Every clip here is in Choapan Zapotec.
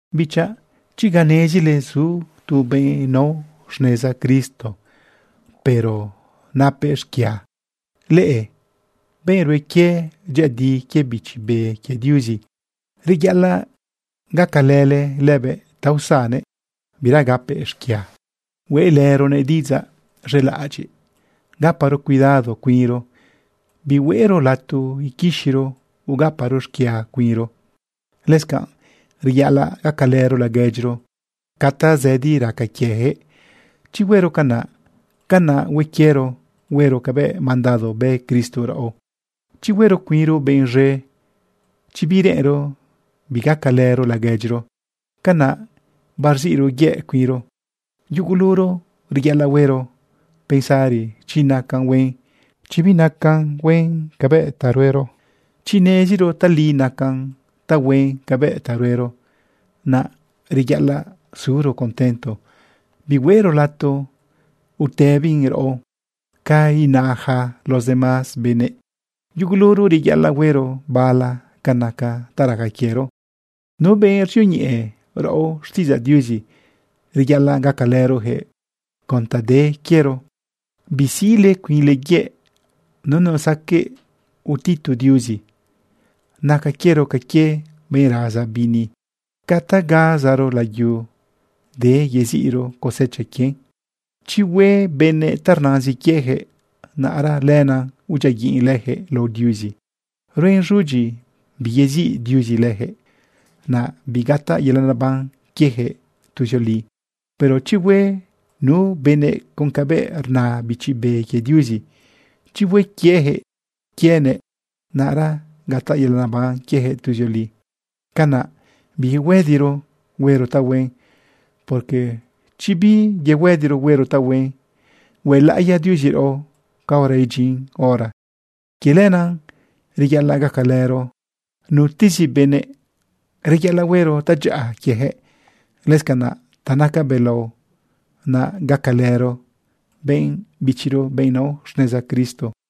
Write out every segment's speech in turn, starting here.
Bichaꞌ, chi ga nezile zu tu benꞌ nao xneza Cristo, pero napëꞌ xquia, leꞌe benꞌ rue quie dyëꞌëdi quie Bichi Be quie Diuzi, reyaꞌalaꞌ gacalële lëbëꞌ ta usannëꞌ bira gapëꞌ xquia. Hueꞌlëronëꞌ diꞌidzaꞌ z̃elaꞌadyiꞌ. Gaparo cuidado cuinro, bihueꞌro lato iquixiro ugaparo xquia cuinro. Lëscanꞌ reyaꞌalaꞌ gacalëro laguedyiro ca tazëdi raca quieyaquëꞌ. Chi huero canaꞌ, canaꞌ hue quiero huero cabëꞌ mandado bë Cristo raꞌo. Chi huero cuinro benꞌ z̃e, chi bireꞌenro bigacalëro laguedyiro, canaꞌ barziꞌro yëꞌ cuinro. Yuguluro reyaꞌalaꞌ huero pensari chi nacan huen, chi binacan huen cabëꞌ ta ruero. Chi neziro tali nacan tahuen cabëꞌ ta ruero, naꞌ reyaꞌalaꞌ suro contento, bihueꞌro lato utëbin raꞌo ca ina yaca los demás benëꞌ. Yuguluro reyaꞌalaꞌ huero bala ca naca ta raca quiero. Nu benꞌ ruzioñeꞌe raꞌo xtiꞌidzaꞌ Diuzi, reyaꞌalaꞌ gacalërojëꞌ con ta de quiero. Bisiꞌle cuinle yëꞌ. Nunu saqueꞌ utitu Diuzi. Naca quiero ca quie benꞌ raza bini. Ca ta gazaro layu, de yeziꞌro cosecha quien. Chi hue benëꞌ ta rnazin quiejëꞌ, naꞌra lenaꞌ udyiaguiꞌn lëjëꞌ lao Diuzi. Ruen z̃udyi biyeziꞌ Diuzi lëjëꞌ, naꞌ bigataꞌ yelaꞌ neban quiejëꞌ tuzioli. Pero chi hue nu benëꞌ con cabëꞌ rna Bichi Be quie Diuzi, chi hue quieyaquëꞌ quienëꞌ, naꞌra gataꞌ yelaꞌ neban quieyaquëꞌ tuzioli. Canaꞌ biyuhuëdiro huero tahuen, porque chi biyuhuëdiro huero tahuen, huelaꞌiya Diuzi raꞌo caora idyin hora. Quie lenaꞌ reyaꞌalaꞌ gacalëro nutezi benëꞌ, reyaꞌalaꞌ huero tadyaꞌa quieyaquëꞌ. Lëscanaꞌ ta naca belao naꞌ gacalëro benꞌ bichiro, benꞌ nao xneza Cristo.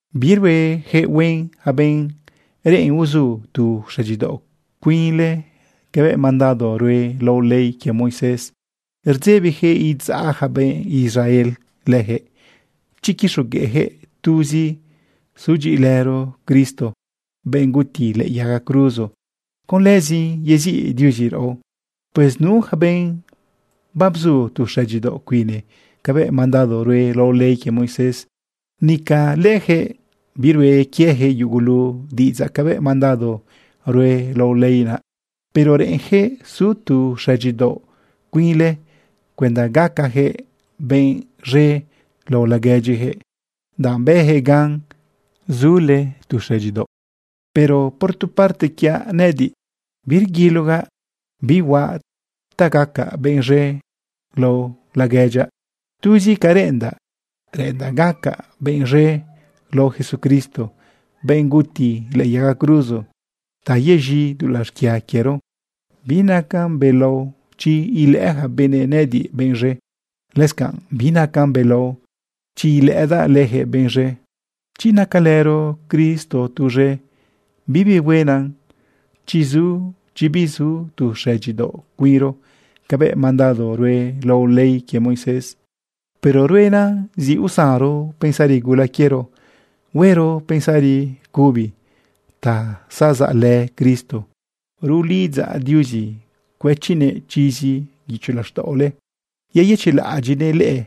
Biruejëꞌ huen yaca benꞌ reꞌen uzu tu xëdyidaoꞌ cuinle cabëꞌ mandado rue lao ley quie Moisés. Rdzebijëꞌ idzaꞌ ja benꞌ Israel lëjëꞌ chi quixogueꞌjëꞌ tuzi sudyiꞌilëro Cristo, benꞌ guti lëꞌë yaga cruzo, con lëzin yeziꞌ Diuzi raꞌo. Pues nu yaca benꞌ babzu tu xëdyidaoꞌ cuine cabëꞌ mandado rue lao ley quie Moisés, nica lëjëꞌ birue quieyaquëꞌ yugulu diꞌidzaꞌ cabëꞌ mandado rue lao ley naꞌ. Pero reꞌenjëꞌ su tu xëdyidaoꞌ cuinle cuenda gacajëꞌ benꞌ z̃e lao laguedyiyaquëꞌ, danꞌ bëjëꞌ gan zule tu xëdyidaoꞌ. Pero por tu parte quiaꞌ nëꞌëdiꞌ, birguilogaꞌ bi huaꞌ ta gaca benꞌ z̃e lao laguedyaꞌ. Tuzi ca reꞌendaꞌ, reꞌendaꞌ gacaꞌ benꞌ z̃e lao Jesucristo, benꞌ guti lëꞌë yaga cruzo ta yez̃i dulaꞌ xquia quiero. Binacan belao chi ilëꞌë yaca benëꞌ nëꞌëdiꞌ benꞌ z̃e. Lëscanꞌ binacan belao chi ilëꞌëdaꞌ leyaquëꞌ benꞌ z̃e. Chi nacalëro Cristo tuz̃e, bibi huenan chi zu, chi bizu tu xëdyidaoꞌ cuinro cabëꞌ mandado rue lao ley quie Moisés. Pero ruenan zi usanro pensari gula quiero huero pensari cubi ta zazaꞌlë Cristo. Rulidzaꞌ Diuzi cuëchinëꞌ chizi guicho laxtaꞌole yeyëchiꞌlaꞌadyiꞌnëꞌ leꞌe,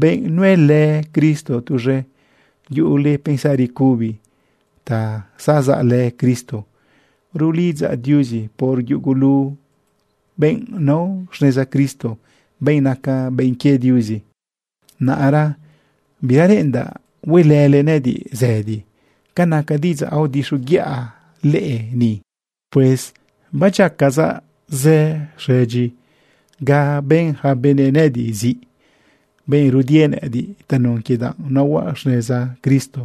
benꞌ nuelë Cristo tuz̃e, yuꞌule pensari cubi ta zazaꞌlë Cristo. Rulidzaꞌ Diuzi por yugulu benꞌ nao xneza Cristo, benꞌ naca benꞌ quie Diuzi. Naꞌra bira reꞌendaꞌ huelële nëꞌëdiꞌ zëdi ca naca diꞌidzaꞌ aodixoguiꞌa leꞌe ni. Pues badyiacazaꞌ zë xëdyi ga bën yaca benëꞌ nëꞌëdiꞌ ziꞌ, benꞌ rudie nëꞌëdiꞌ tanun quie danꞌ naohuaꞌ xneza Cristo.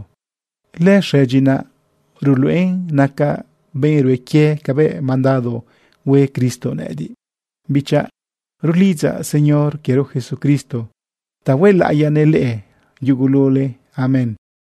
Lëxëdyi naꞌ ruluꞌen nacaꞌ benꞌ rue quie cabëꞌ mandado hue Cristo nëꞌëdiꞌ. Bichaꞌ, rulidzaꞌ Señor quiero Jesucristo ta huelaꞌiyanëꞌ leꞌe yugulule. Amén.